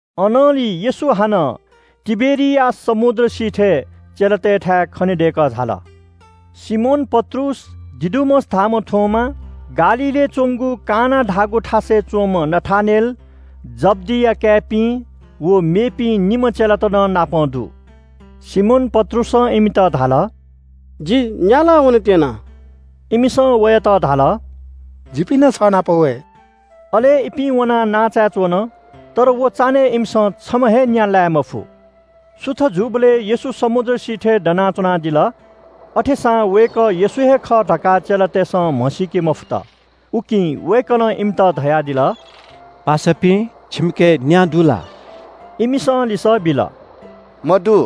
अनंलि येशू हानं तिबेरियास समुद्र सिथय् चेलातय्‌थाय् खनेदय्‌कः झाल। सिमोन पत्रुस, दिदुमस धाःम्‍ह थोमा, गालीलय् च्‍वंगु काना धाःगु थासय् च्‍वंम्‍ह नथानेल, जब्‍दिया काय्‌पिं व मेपिं निम्‍ह चेलात नं नापं दु। सिमोन पत्रुसं इमित धाल – “जि न्‍या लाः वनेत्‍यना।” इमिसं वयात धाल – “जिपिं नं छ नाप वये।” अले इपिं वनाः नांचाय् च्‍वन। तर व चान्‍हय् इमिसं छम्‍ह हे न्‍या लाये मफु। सुथ जूबलय् येशू समुद्र सिथय् दना च्‍वनादिल। अथेसां वय्‌कः येशू हे खः धकाः चेलातय्‌सं म्‍हसीके मफुत। उकिं वय्‌कलं इमित धयादिल – “पासापिं, छिमिके न्‍या दु ला?” इमिसं लिसः बिल – “मदु।”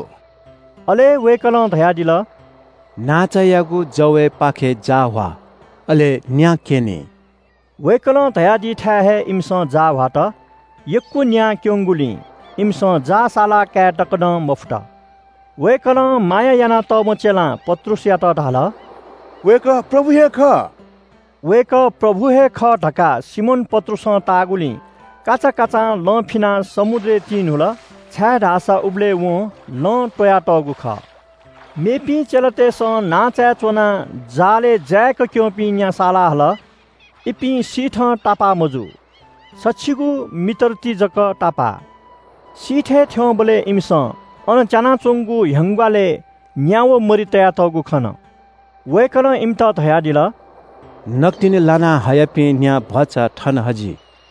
अले वय्‌कलं धयादिल – “नांचायागु जवय्‌पाखे जाः ह्वा, अले न्‍या क्‍यनी।” वय्‌कलं धयादीथाय् हे इमिसं जाः ह्वात। यक्‍व न्‍या क्‍यंगुलिं इमिसं जाः सालाकाये तक नं मफुत। वय्‌कलं माया यानातःम्‍ह चेलां पत्रुसयात धाल – “वय्‌कः प्रभु हे खः।” वय्‌कः प्रभु हे खः धकाः सिमोन पत्रुसं ताःगुलिं काचाकाचां लं फिनाः समुद्रय् तिन्‍हुल, छाय्‌धाःसा उबलय् वं लं त्‍वयातःगु खः। मेपिं चेलातय्‌सं नांचाय् च्‍वनाः जालय् जाय्‌क क्‍यंपिं न्‍या सालाहल। इपिं सिथं तापाः मजू। सछिगू मिटर ति जक तापाः। सिथय् थ्‍यंबलय् इमिसं अन च्‍यानाच्‍वंगु ह्यंग्‍वालय् न्‍या व मरि तयातःगु खन। वय्‌कलं इमित धयादिल – “नकतिनि लाना हयापिं न्‍या भचा थन हजि।”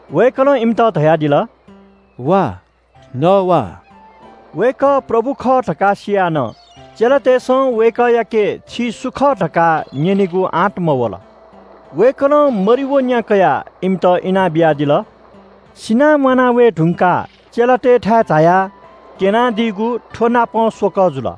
वय्‌कलं इमित धयादिल – “वा, नः वा!” वय्‌कः प्रभु खः धकाः सियाः नं चेलातय्‌सं वय्‌कःयाके “छि सु खः” धकाः न्‍यनेगु आँट मयात। वय्‌कलं मरि व न्‍या कयाः इमित इनाबियादिल। सिनाः म्‍वाना वये धुंकाः चेलातय्‌थाय् झायाः क्‍यनादीगु थ्‍वनापं स्‍वकः जुल।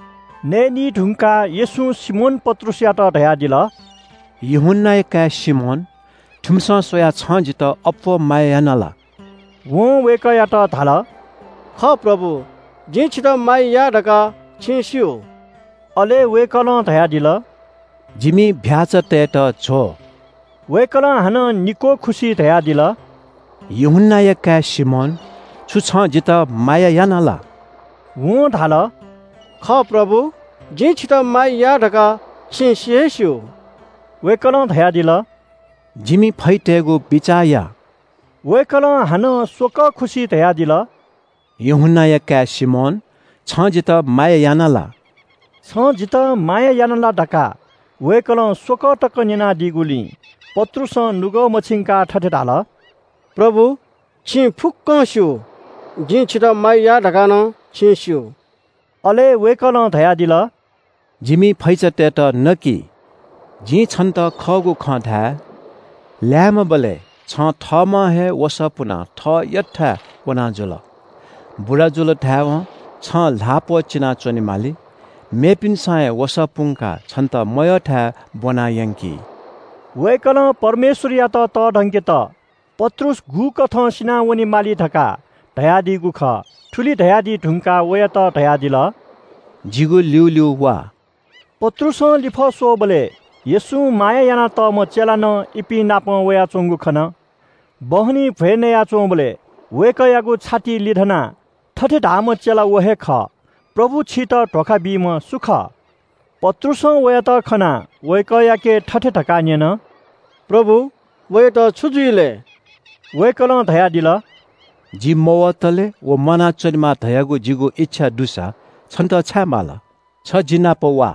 नयेनी धुंकाः येशूं सिमोन पत्रुसयात धयादिल – “यूहन्‍नाया काय् सिमोन, थुमिसं स्‍वयाः छं जितः अप्‍वः माया याना ला?” वं वय्‌कःयात धाल – “खः प्रभु, जिं छितः माया याः धकाः छिं स्‍यू।” अले वय्‌कलं धयादिल – “जिमि चीधिकःपिं भ्‍याःचातय्‌त ज्‍व।” वय्‌कलं हानं निक्‍वः खुसि धयादिल – “यूहन्‍नाया काय् सिमोन, छु छं जितः माया याना ला?” वं धाल “खः प्रभु, जिं छितः माया याः धकाः छिं सि हे स्‍यू।” वय्‌कलं धयादिल – “जिमि फैचातय्‌त बिचाः या।” वय्‌कलं हानं स्‍वक्‍वः खुसि धयादिल – “यूहन्‍नाया काय् सिमोन, छं जितः माया याना ला?” “छं जितः माया याना ला” धकाः वय्‌कलं स्‍वकः तक न्‍यनादीगुलिं पत्रुसं नुगः मछिंकाः थथे धाल – “प्रभु, छिं फुक्‍कं स्‍यू, जिं छितः माया याः धकाः नं छिं स्‍यू।” अले वय्‌कलं धयादिल – “जिमि फैचातय्‌त ज्व। “जिं छन्‍त खःगु खँ धाये – ल्‍याय्‌म्‍हबलय् छं थःम्‍हं हे वसः पुनाः थः यःथाय् वना जुल। बुरा जुल धाय्‌वं छं ल्‍हाः प्‍वःचिनाः च्‍वनेमाली। मेपिन्‍सं हे वसः पुंकाः छन्‍त मयःथाय् ब्‍वना यंकी।” वय्‌कलं परमेश्‍वरयात तःधंकेत पत्रुस गुकथं सिनावनेमाली धकाः धयादीगु खः। थुलि धयादी धुंकाः वयात धयादिल – “जिगु ल्‍यूल्‍यू वा।” पत्रुसं लिफः स्‍वःबलय् येशूं माया यानातःम्‍ह चेला नं इपिं नाप वयाच्‍वंगु खन। बहनी भ्‍वय् नयाच्‍वंबलय् वय्‌कःयागु छातिइ लिधनाः थथे धाःम्‍ह चेला व हे खः – “प्रभु, छितः धोखा बीम्‍ह सु खः?” पत्रुसं वयात खनाः वय्‌कःयाके थथे धकाः न्‍यन – “प्रभु, वयात छु जुइ लय्?” वय्‌कलं धयादिल – “जि मवतले व म्‍वानाच्‍वनेमा धयागु जिगु इच्‍छा दुसा छन्‍त छाय् माल?” छ जिनापं वा।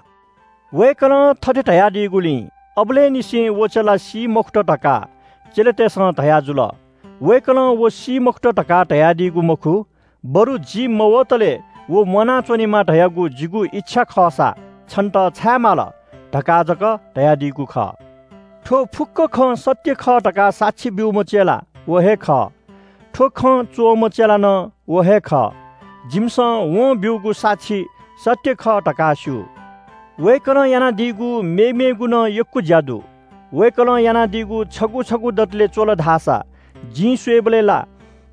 वय्‌कलं थथे धयादीगुलिं अबलय् निसें व चेला सी मखुत धकाः चेलातय्‌सं धयाजुल। वय्‌कलं व सी मखुत धकाः धयादीगु मखु, बरु “जि मवतले व म्‍वानाच्‍वनेमा धयागु जिगु इच्‍छा खःसा छन्‍त छाय् माल?” धकाः जक धयादीगु खः। थ्‍व फुक्‍क खँ सत्‍य खः धकाः साक्षी ब्‍यूम्‍ह चेला व हे खः। थ्‍व खँ च्‍वःम्‍ह चेला नं व हे खः। जिमिसं वं ब्‍यूगु साक्षी सत्‍य खः धकाः स्‍यू। वय्‌कलं यानादीगु मेमेगु नं यक्‍व ज्‍या दु। वय्‌कलं यानादीगु छगू छगू दतले च्‍वल धाःसा जिं स्‍वयेबलय् ला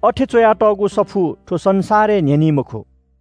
अथे च्‍वयातःगु सफू थ्‍व संसारय् न्‍ह्यनी मखु।